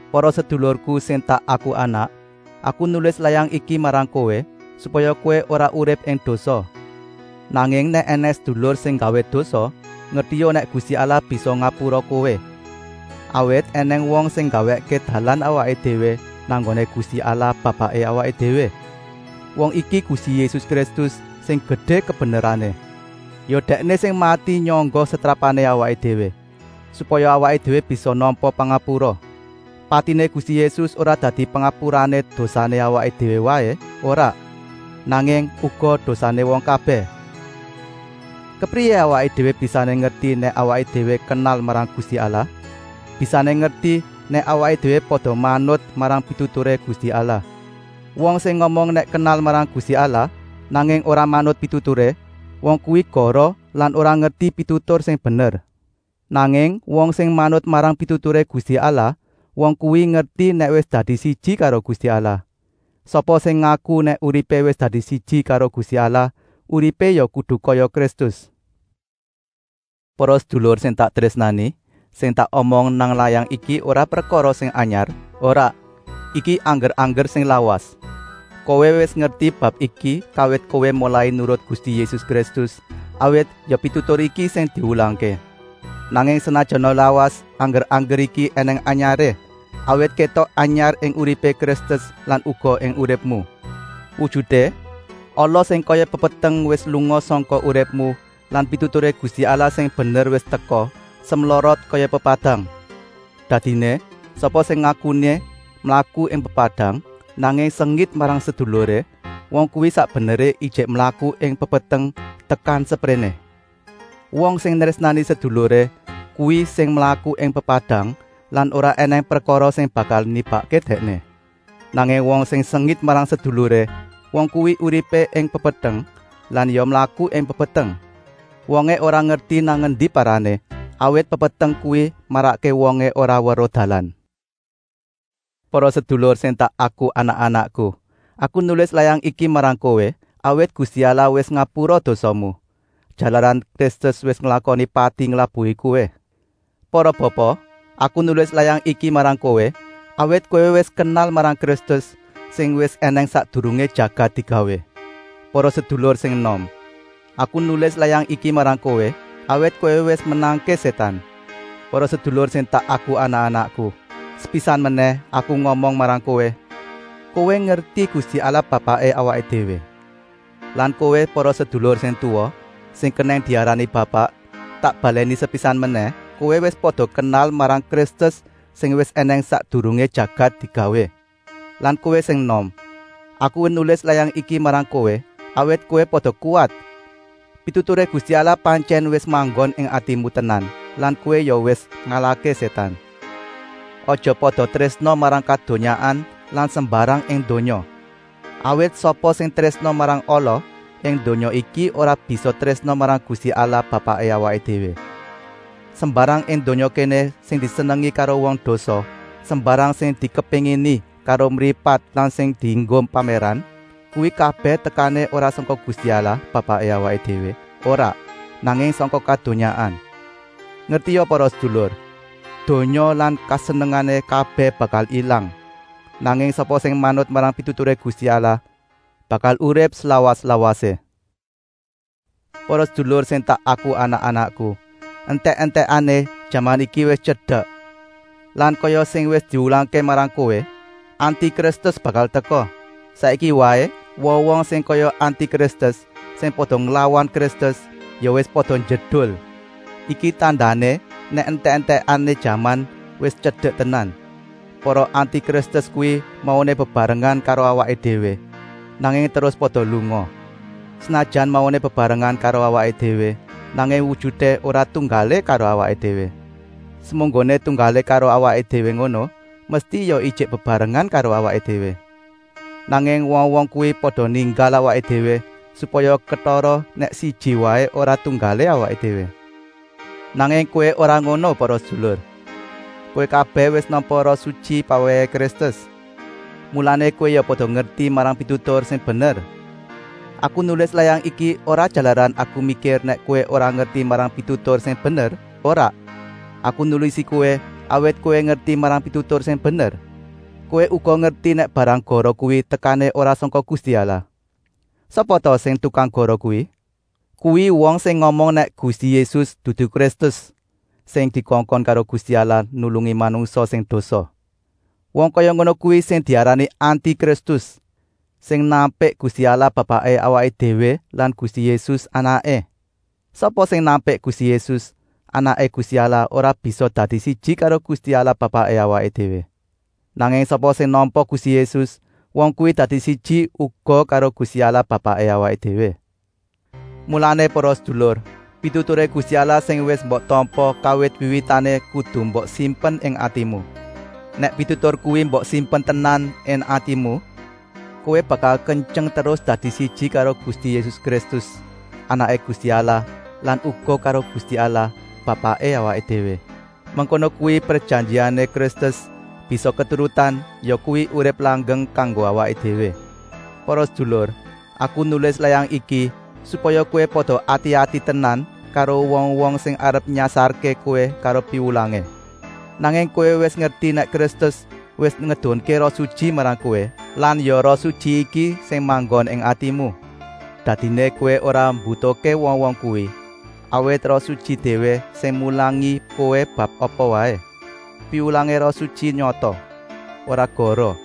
Para sedulurku sing tak aku anak, aku nulis layang iki marang kowé, supaya kowé ora urip ing dosa. Nanging nèk ènèng sedulur sing nggawé dosa, ngertia nèk Gusti Allah bisa ngapura kowé, awit ènèng wong sing nggawèkké dalan awaké déwé nang nggoné Gusti Allah Bapaké awaké déwé. Wong iki Gusti Yésus Kristus, sing gedé kabenerané. Ya Dèkné sing mati nyangga setrapané awaké déwé, supaya awaké déwé bisa nampa pangapura. Patiné Gusti Yésus ora dadi pangapurané dosané awaké déwé waé, ora, nanging uga dosané wong kabèh. Kepriyé awaké déwé bisané ngerti nèk awaké déwé kenal marang Gusti Allah? Bisané ngerti, nèk awaké déwé pada manut marang pituturé Gusti Allah. Wong sing ngomong nèk kenal marang Gusti Allah, nanging ora manut pituturé, wong kuwi goroh lan ora ngerti pitutur sing bener. Nanging wong sing manut marang pituturé Gusti Allah, wong kuwi ngerti nèk wis dadi siji karo Gusti Allah. Sapa sing ngaku nèk uripé wis dadi siji karo Gusti Allah, uripé ya kudu kaya Kristus. Para sedulur sing tak trésnani, sing tak omong nang layang iki ora prekara sing anyar, ora, iki angger-angger sing lawas; kowé wis ngerti bab iki kawit kowé molai nurut Gusti Yésus Kristus, awit ya pitutur iki sing diwulangké. Nanging senajana lawas, angger-angger iki ènèng anyaré, awit kétok anyar ing uripé Kristus lan uga ing uripmu. Wujuté, ala sing kaya pepeteng wis lunga sangka uripmu lan pituturé Gusti Allah sing bener wis teka, semlorot kaya pepadang. Dadiné, sapa sing ngakuné mlaku ing pepadang, nanging sengit marang seduluré, wong kuwi sak beneré ijik mlaku ing pepeteng tekan sepréné. Wong sing nrésnani seduluré, kuwi sing mlaku ing pepadang lan ora ènèng prekara sing bakal nibakké dèkné. Nanging wong sing sengit marang seduluré, wong kuwi uripé ing pepeteng lan ya mlaku ing pepeteng. Wongé ora ngerti nang endi parané, awit pepeteng kuwi marakké wongé ora weruh dalan. Para sedulur sing tak aku anak-anakku, aku nulis layang iki marang kowé, awit Gusti Allah wis ngapura dosamu, jalaran Kristus wis nglakoni pati nglabuhi kowé. Para bapa, aku nulis layang iki marang kowé, awit kowé wis kenal marang Kristus, sing wis ènèng sakdurungé jagat digawé. Para sedulur sing enom, aku nulis layang iki marang kowé, awit kowé wis menangké Sétan. Para sedulur sing tak aku anak-anakku, sepisan menèh aku ngomong marang kowé: kowé ngerti Gusti Allah Bapaké awaké déwé. Lan kowé para sedulur sing tuwa, sing kenèng diarani bapak, tak balèni sepisan menèh, kowé wis pada kenal marang Kristus sing wis ènèng sakdurungé jagat digawé. Lan kowé sing enom, aku nulis layang iki marang kowé, awit kowé pada kuwat. Pituturé Gusti Allah pantyèn wis manggon ing atimu tenan lan kowé ya wis ngalahké Sétan. Aja pada trésna marang kadonyaan lan sembarang ing donya. Awit sapa sing trésna marang ala ing donya iki ora bisa trésna marang Gusti Allah Bapaké awaké déwé. Sembarang ing donya kéné sing disenengi karo wong dosa, sembarang sing dikepéngini karo mripat lan sing dienggo pamèran, kuwi kabèh tekané ora sangka Gusti Allah Bapaké awaké déwé, ora, nanging sangka kadonyaan. Ngertia para sedulur, donya lan kesenengané kabèh bakal ilang. Nanging sapa sing manut marang pituturé Gusti Allah bakal urip slawas-lawasé. Para sedulur sing tak aku anak-anakku, entèk-entèkané jaman iki wis tyedek. Lan kaya sing wis diwulangké marang kowé, Anti-Kristus bakal teka. Saiki waé wong-wong sing kaya Anti-Kristus, sing pada nglawan Kristus, ya wis pada njedul. Iki tandané nèk entèk-entèkané jaman wis tyedek tenan. Para Anti-Kristus kuwi mauné bebarengan karo awaké déwé, nanging terus pada lunga. Senajan mauné bebarengan karo awaké déwé, nanging wujuté ora tunggalé karo awaké déwé. Semunggoné tunggalé karo awaké déwé ngono, mesti ya ijik bebarengan karo awaké déwé. Nanging wong-wong kuwi pada ninggal awaké déwé, supaya ketara nèk siji waé ora tunggalé awaké déwé. Nanging kowé ora ngono para sedulur. Kowé kabèh wis nampa Roh Sutyi pawèhé Kristus. Mulané kowé ya pada ngerti marang pitutur sing bener. Aku nulis layang iki ora jalaran aku mikir nèk kowé ora ngerti marang pitutur sing bener, ora. Aku nulisi kowé, awit kowé ngerti marang pitutur sing bener. Kowé uga ngerti nèk barang goroh kuwi tekané ora sangka Gusti Allah. Sapa ta sing tukang goroh kuwi? Kuwi wong sing ngomong nèk Gusti Yésus dudu Kristus, sing dikongkon karo Gusti Allah nulungi manungsa sing dosa. Wong kaya ngono kuwi sing diarani Anti-Kristus, sing nampik Gusti Allah Bapaké awaké déwé lan Gusti Yésus, Anaké. Sapa sing nampik Gusti Yésus, Anaké Gusti Allah, ora bisa dadi siji karo Gusti Allah Bapaké awaké déwé. Nanging sapa sing nampa Gusti Yésus, wong kuwi dadi siji uga karo Gusti Allah Bapaké awaké déwé. Mulané para sedulur, pituturé Gusti Allah sing wis mbok tampa kawit wiwitané kudu mbok simpen ing atimu. Nèk pitutur kuwi mbok simpen tenan ing atimu, kowé bakal kentyeng terus dadi siji karo Gusti Yésus Kristus, Anaké Gusti Allah lan uga karo Gusti Allah, Bapaké awaké déwé. Mengkono kuwi prejanjiané Kristus bisa keturutan, yakuwi, urip langgeng kanggo awaké déwé. Para sedulur, aku nulis layang iki, supaya kowé pada ati-ati tenan karo wong-wong sing arep nyasarké kowé karo piwulangé. Nanging kowé wis ngerti nèk Kristus wis ngedunké Roh Sutyi marang kowé lan ya Roh Sutyi iki sing manggon ing atimu. Dadiné kowé ora mbutuhké wong-wong kuwi, awit Roh Sutyi déwé sing mulangi kowé bab apa waé. Piwulangé Roh Sutyi nyata, ora goroh,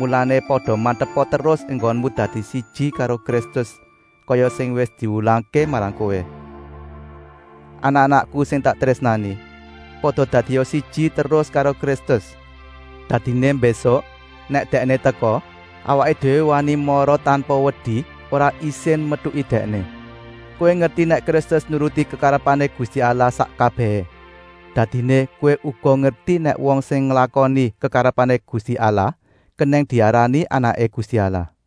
mulané, pada mantepa terus enggonmu dadi siji karo Kristus, kaya sing wis diwulangké marang kowé. Anak-anakku sing tak trésnani, pada dadia siji terus karo Kristus. Dadiné mbésuk, nèk Dèkné teka, awaké déwé wani mara tanpa wedi, ora isin metuki Dèkné. Kowé ngerti nèk Kristus nuruti kekarepané Gusti Allah sak kabèhé, dadiné kowé uga ngerti nèk wong sing nglakoni kekarepané Gusti Allah kenèng diarani anaké Gusti Allah.